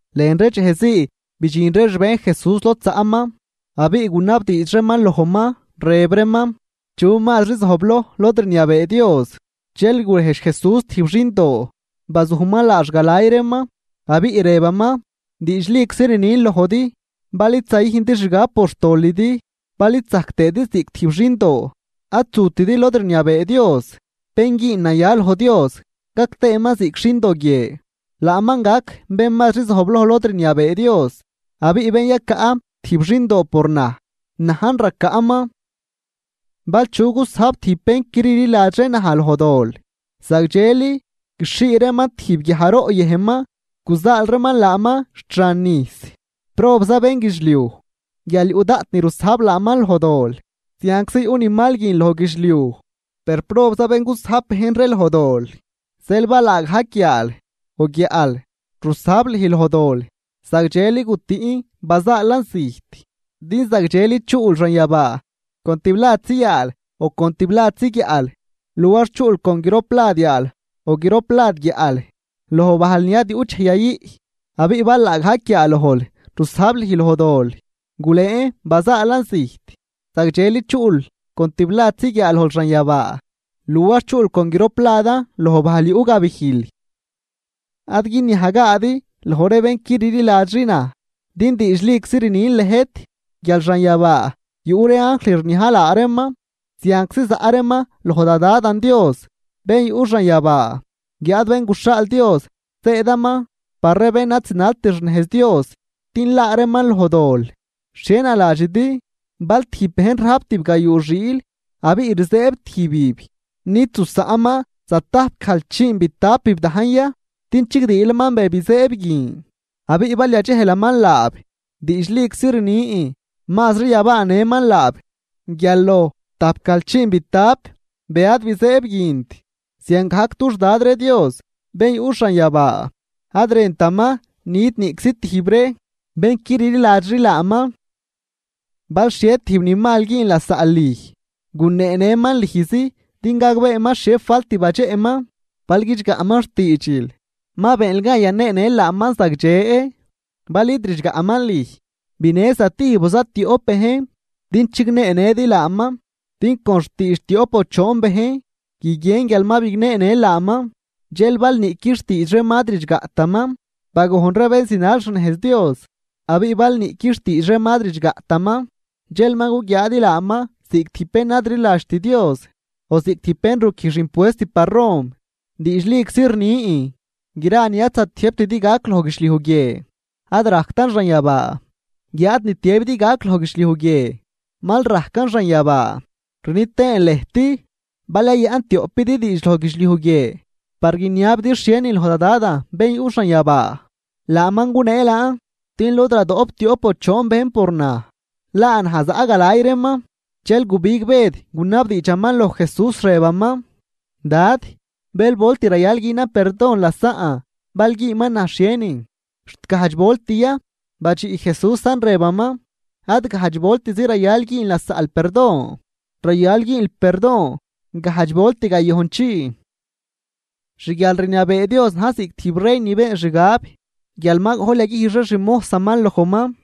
Lën ree dxejzii bidxin ree xbejn Jesús lod zaꞌman, abiꞌ gunabdiidx reeman lojman, rëb reeman: ―¿Chu mazri zojbloj lod rniabee Dios? Dxel gurejdx Jesús tijb xindoo, bazujman laax galay reeman, abiꞌ rëbaman: ―Diidxliczi rnin lojdi bal id zayüjndi xgab por xtolidi, bal id zajc tëëdi ziꞌc tijb xindoo, ad zutidi lod rniabee Dios. Bén güün naya loj Dios, gac tëëman ziꞌc xindo guie, laaman gac bén mazri zojbloj lod rniabee Dios. Abiꞌ bén yacaꞌ tijb xindoo, por naj, najn racaꞌman. ’Bal chu gusajb tijb bén qui rliladxri naj loj dol, zagdxeli guixhii reeman tijb guiajroꞌ yëjnman guzaal reeman laaman xt xan nijs. ¡Probza bénguidxliuj guial yuꞌ daꞌt ni rusajb laaman loj dol! Zianczi yuꞌ ni mal guin loj guidxliuj, per ¡probza bén gusajb bejn ree loj dol! ’Zeel, bal laagajc yaal o guiaꞌl rusajb lüj loj dol, zagdxeli gutüꞌn bazaalan zijt, din zagdxeli chuꞌl xanyabaa con tibladzi yaal o con tibladzi guiaꞌl, luar chuꞌl con groplad yaal o groplad guiaꞌl loj bajl ni ad yuꞌt dxej yayüꞌ. Abiꞌ bal laagajc guiaalojl rusajb lüj loj dol, gulëën bazaalan zijt, zagdxeli chuꞌl con tibladzi guiaalojl xanyabaa, luar chuꞌl con gropladan loj bajl yuꞌ gabijl. ’Ad guiniajgaadi loj ree bén qui rliladxri naj. Din diidxliczi rnin lëjt guial xanyabaa yuꞌ ree anjl rniaj laa reeman zianczi zaꞌ reeman loj da Dadan Dios bén yuꞌ xanyabaa. Guiáad Bén guxhaal Dios zëëdaman par ree bén ad zinalt xnejz Dios din laa reeman loj dol. ’¿Xhie naladxidi? Bal tijb bejn rajp tibgayuu xiil, abiꞌ rizëëb tijbib, ¿nid zusaꞌnman zatajpgajlchiinbitapib dajn ya din chigdiilaman be bizëëb guin? Abiꞌ bal yadxejlaman laab, diidxliczi rnin mazri yabaanëman laab guial loj tajpgajlchiinbitap be ad bizëëb guint. Ziangajc dux Dad ree Dios bén yuꞌ xanyabaa ad rëntaman nit niꞌczi tijb ree bén qui rliladxri laaman. ’Bal xhie tijb ni mal güün lasaꞌl lüj, guneenëman lüjzi din gagbeeman xhie falt badxeꞌman. Bal guidxgaꞌman xtiidxil, ma beenl gan yaneenël laaman zagdxe. Bal id ridxgaꞌman lüj, binë zatijb o zatioꞌp bejn, din chigneenëdi laaman din con xtiidx tioꞌp o choon bejn guiguien guial ma bigneenël laaman. Dxel bal niꞌqui xtiidx reeman ad ridxgaꞌtaman, bagojn ree bén zinal xnejz Dios, abiꞌ bal niꞌqui xtiidx reeman ad ridxgaꞌtaman, dxel ma guguiaadi laaman ziꞌc tijb bén ad rliladxt Dios o ziꞌc tijb bén ruquijx impuest par Rom. ’Diidxliczi rnin, gra ni ad zatiëjbtidi gac loj guidxliuj guie ad rajctan xanyabaa, guiáad ni tiëbidi gac loj guidxliuj guie mal rajcan xanyabaa. ’Rni tëën lëjt: Bal yayaꞌn tioꞌpidi diidx loj guidxliuj guie, par guiniabidi xhienin loj da Dadan bén yuꞌ xanyabaa, laaman gunee laan. Din lod radoꞌp tioꞌp o choon bejn por naj, laa naj zaꞌ galay reeman. Dxel gubig Bëd gunabdiidxaman loj Jesús, rëbaman: ―Dad, ¿bël volt rayal günan perdon lasaꞌn, bal güünman naj xhienin? ¿Xt gajdx volt ya? Badxiꞌ Jesúsan rëbaman: ―Ad gajdx voltizi rayal güün lasaꞌl perdon, rayal güünl perdon gajdx volt gayojnchii. ’Xguialrniabee Dios na̱j ziꞌc tijb rey ni been xgab guial ma gojl yaguijx ree xmojsaman lojman.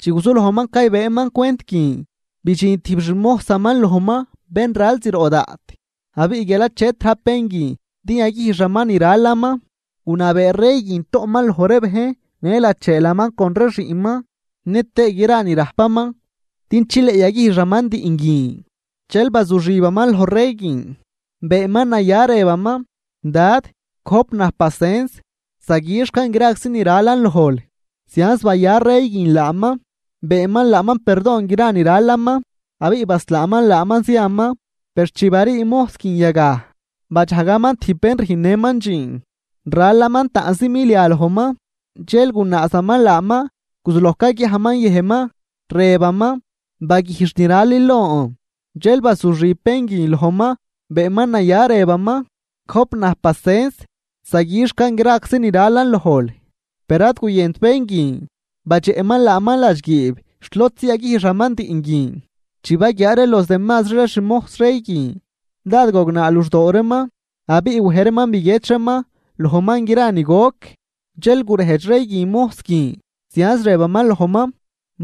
Chi guzulojman caybëëman cwent guin, bidxin tijb xmojsaman lojman bén ral zroꞌ daꞌt. Abiꞌ guial achet rajp bén guin din yaguijxaman ni ralaman, gunabee rey guin toꞌman loj ree bejn në lacheelaman con ree xiꞌnman nëtëë gra ni rajpaman din chileꞌ yaguijxaman diꞌn guin. Dxel bazuxibaman loj rey guin, beenman naya rëbaman: “Dad, gojp naj pacens zaguixcan graczi ni ralan lojl.” Zianz baya rey guin laaman, beenman laaman perdon gra ni ralaman, abiꞌ baslaaman laaman ziaman. Per chi barii mojs guin yagaj, badxajgaman tijb bén rüjnnëman dxiin, ralaman taꞌnzi milia lojman. Dxel gunaazaman laaman guzuloj caguiajman yëjnman, rëbaman: “¡Baguijx ni ralil lon!” Dxel bazuxib bén guin lojman beenman naya rëbaman: “Gojp naj pacens zaguixcan graczi ni ralan lojl.” Per ad guyënt bén guin, badxeꞌman laaman ladxguiib xt lodzi yaguijxaman diꞌn guin. Chi baguiaa ree los demazri ree xmojs rey guin, dád gognaa luxdoo reeman, abiꞌ wej reeman biguiedx reeman lojman gra ni goc. Dxel gurejdx rey guin mojs guin, zianz rëbaman lojman: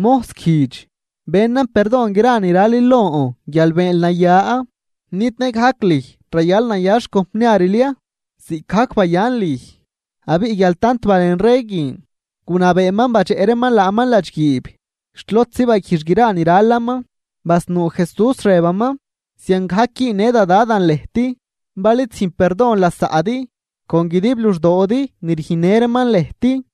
“¡Mojs guijdx! Benan perdon gra ni ralil lon guial beenl naya. ¿Nid nëgajc lüj rayal naya xcompniaril ya, ziꞌcgajc bayan lüj?” Abiꞌ guial tant balen rey guin, gunabeeman badxeꞌ reeman laaman ladxguiib xt lodzi baguijx gra ni ralaman. Basnuu Jesús rëbaman: ―Ziangajc güünnë da Dadan lëjt, bén yuꞌ xanyabaa, bal id züjn perdon lasaꞌdi con guidib luxdoodi ni rüjnnë reeman lëjt.